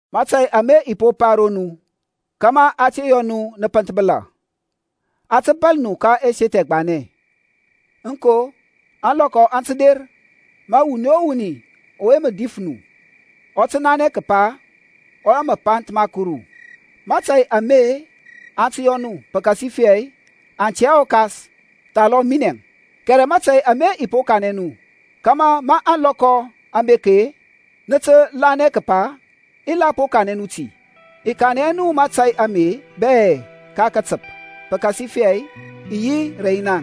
Mȧtȧy ame i po pa ro nu, kȧmȧ a te yɔ nu nə pənthbəla. Aŋ tə bȧl nu ka ɛseth ɛgbanɛ: aŋko, ȧŋlɔkɔ aŋ tə der, ma wuni o wuni ɔwe mə dif nu, ɔ tə nanɛ kəpa ɔ yɔ mapanth ma Kuru. Mȧtȧy ame aŋ tə yɔ nu, pəkasifɛ aŋ tɛ hɛ ɔKas, thalɔm minɛŋ. Kɛrɛ mȧtȧy ame i po kanɛ nu kȧmȧ ma ȧŋlɔkɔ aŋ bek-e, nə tə kȧl nanɛ kəpa i la po kanɛ nu ti. I kanɛ hɛ nu mȧtȧy ame bɛ ka katəp, pəkasifɛ i yi rɛ naŋ.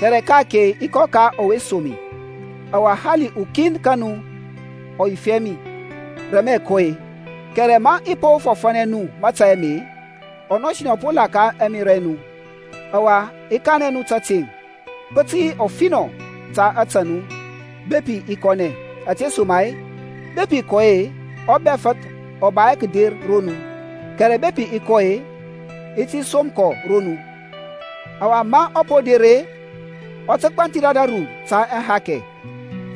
Kɛrɛ ka-ake i kɔ ka ɔwe som mi; ɔwa hali ukin ka nu ɔ yif hɛ mi, Re mə-əŋ kɔ-e? Kɛrɛ ma i po fɔfȧnɛ nu mȧtȧy ame, ɔnɔsinɛ ɔ po la ka ɛmerȧ ɛ nu. Ɔwa i kanɛ nu tȧteŋ, pə tə yi ɔfinɔ ta ȧtȧ nu bepi i kɔnɛ: ȧtesoma-e, bepi i kɔ hɛ-e, ɔBɛfəth ɔ ba hɛ kəder ro nu; kɛrɛ bepi i kɔ-e, i ti som kɔ ro nu. Ɔwa ma ɔ po der-e, ɔ tə gbanthir ȧdȧru ta ahakɛ,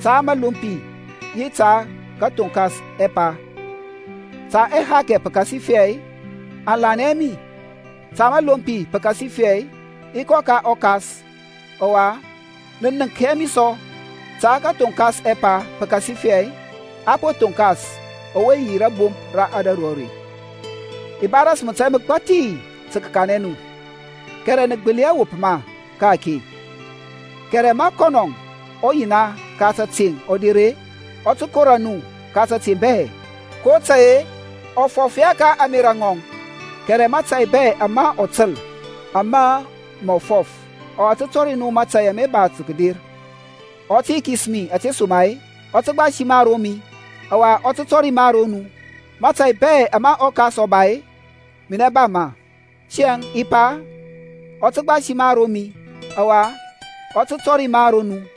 ta məlompi, yi ta kəthoŋkas ɛpa: ta ahakɛ, pəkasifɛ aŋ lanɛ hɛ mi; ta məlompi, pəkasifɛ i kɔ ka ɔKas ɔwa nə nənk hɛ mi sɔ; ta kəthoŋkas ɛpa, pəkasifɛ a po thonkas ɔwe yi rȧbomp ra ȧdȧru are. I ba ras mȧtȧy məgbathi tə kəkanɛ nu, kɛrɛ nə gbəli hɛ wop ma ka-ake. Kɛrɛ ma kɔnɔŋ, ɔYina ka təteŋ, ɔ der-e, ɔ tə kora nu ka tȧteŋ bɛ; kotȧy-e, ɔ fɔf hɛ ka ȧŋmerȧ ŋɔŋ; kɛrɛ mȧtȧy bɛ ama ɔ təl, ame ma mɔ fɔf: ɔwa ɔ tə tɔri nu mȧtȧy ama ba tə kəder. Ɔ tə yikis mi; ȧtesoma-e, ɔ tə gbasi ma ro mi, ɔwa ɔ tə tɔri ma ro nu. Mȧtȧy bɛ ama ɔKas ɔ ba-e, minɛ ba ma: tiyȧŋ i pa, ɔ tə gbasi ma ro mi, ɔwa ɔ tə tɔri ma ro nu.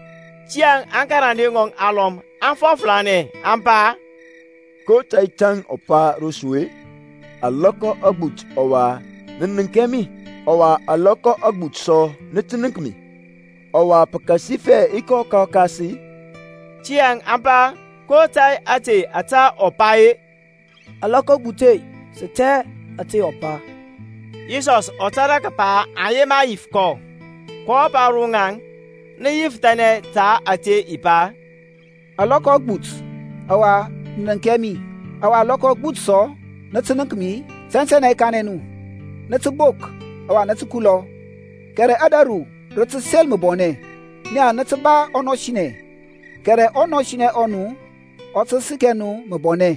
Tiyȧŋ aŋkarande ŋɔŋ alɔm aŋ fɔflanɛ, aŋ pa, Ko tȧy ȧte ȧtȧ ɔ pa ro su-e? Alɔkɔ agbut ɔwa nə nənk hɛ mi; ɔwa alɔkɔ agbut sɔ nə tə nənk mi: ɔwa pəkasifɛ i kɔ ka ɔKas-i? Tiyȧŋ aŋ pa, Ko tȧy ȧte ȧtȧ ɔ pa-e, Alɔkɔ agbut-e? Sə tɛ hɛ ȧte ɔ pa. Yisɔsȧŋ ɔ tȧrȧ kəpa aŋ yema yif kɔ, kɔ pa ro ŋaŋ, Nə yifəthanɛ ta ȧte i pa, Alɔkɔ agbut, ɔwa nə nənk hɛ mi, ɔwa alɔkɔ agbut sɔ, nə tə nənk mi-i? Tɛntɛnɛ i kanɛ nu, nə tə bok ɔwa nə tə kulɔ, kɛrɛ ȧdȧru rə tə sel məbɔnɛ: naŋ nə tə ba ɔnɔsinɛ, kɛrɛ ɔnɔsinɛ ɔ nu ɔ tə səkɛ nu məbɔnɛ.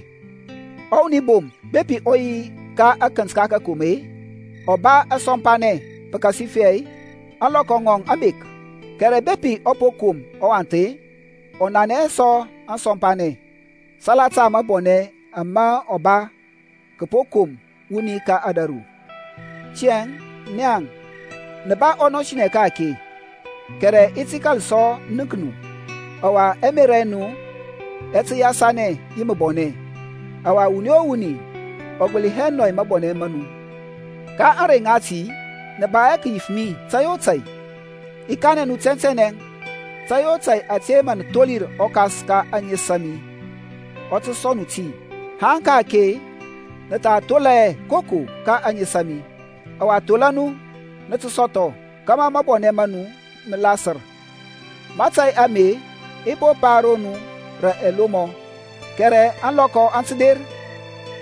Ɔwuni bom bepi ɔ yi ka akənt ka kakom-e, ɔ ba asɔmpanɛ, pəkasifɛ ȧŋlɔkɔ ŋɔŋ aŋ bek: kɛrɛ bepi ɔ po kom ɔwath-e, ɔ nanɛ hɛ sɔ ȧŋsɔmpanɛŋ, salata mabɔnɛ ama ɔ ba kəpo kom wuni ka ȧdȧru. Tiyȧŋ naŋ nə ba ɔnɔsinɛ ka-ake; kɛrɛ i ti kȧl sɔ nənk nu, ɔwa ɛmerȧ ɛ nu ɛ tə yasanɛ yi məbɔnɛ, ɔwa wuni o wuni ɔ gbəli hɛ nɔy mabɔnɛ ma nu. Ka ȧŋrey ŋati nə ba hɛ kəyif mi tȧy o tȧy. I kanɛ nu tɛntɛnɛ, tȧy o tȧy ȧte mə nə tholir ɔKas ka ȧŋes a mi, ɔ tə sɔŋ nu ti. Haŋ ka-ake nə tha thola hɛ koko ka ȧŋes a mi: ɔwa thola nu, nə tə sɔthɔ, kȧmȧ mabɔnɛ ma nu mə lasər. Mȧtȧy ame i po pa ro nu rə ɛlomɔ: kɛrɛ ȧŋlɔkɔ aŋ tə der,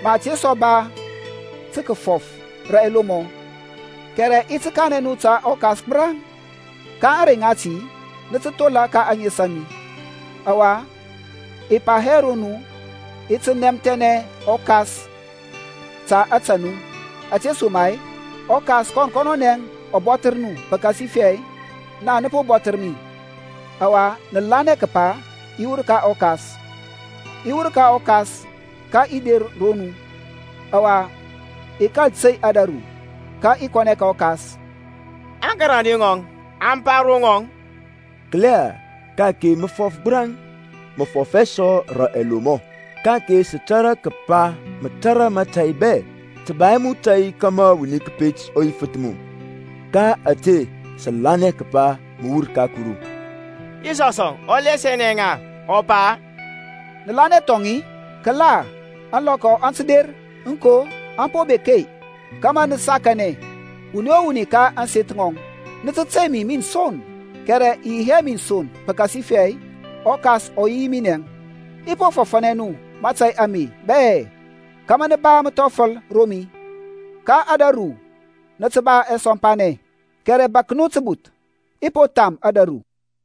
ma i te sɔ ba tə kəfɔf rə ɛlomɔ, kɛrɛ i ti kanɛ nu ta ɔKas gbəraŋ. Ka ȧŋrey ŋati nə tə thola ka ȧŋes a mi: ɔwa i pa hɛ ro nu, i ti nɛmthɛnɛ ɔKas ta ȧtȧ nu: ȧtesoma-e ɔKas kɔn kɔnɔnɛ ɔ bɔthər nu, pəkasifɛ naŋ nə po bɔthər mi, ɔwa nə lanɛ kəpa i wur ka ɔKas. I wur ka ɔKas, ka i der nɔru: ɔwa i kȧl tey ȧdȧru, ka i kɔnɛ ka ɔKas. Aŋkarande ŋɔŋ aŋ pa ro ŋɔŋ, Kəla, ka-ake mə fɔf gbəraŋ, mə fɔf hɛ sɔ rə alomɔ. Ka-ake sə tȧrȧ kəpa mə tȧrȧ mȧtȧy bɛ, tə ba hɛ mu tȧy kȧmȧ wuni kəpet ɔ yifəth mu: ka ȧte sə lanɛ kəpa mə wur ka Kuru. Yisɔsȧŋ ɔ lasianɛ ŋa, ɔ pa, Nə lanɛ thɔŋ-i? Kəla, ȧŋlɔkɔ aŋ tə der, aŋko, an po bek-e, kȧmȧ nə sakanɛ, wuni o wuni ka ȧŋseth ŋɔŋ, nə tə tey mi min son, kɛrɛ i yi hɛ min son, pəkasifɛ ɔKas ɔ yi yi minɛŋ. I po fɔfȧnɛ nu mȧtȧy ame bɛ, kȧmȧ nə ba məthɔfəl ro mi. Ka ȧdȧru nə tə ba asɔmpanɛ: kɛrɛ bȧk nu təbuth, i po tham ȧdȧru.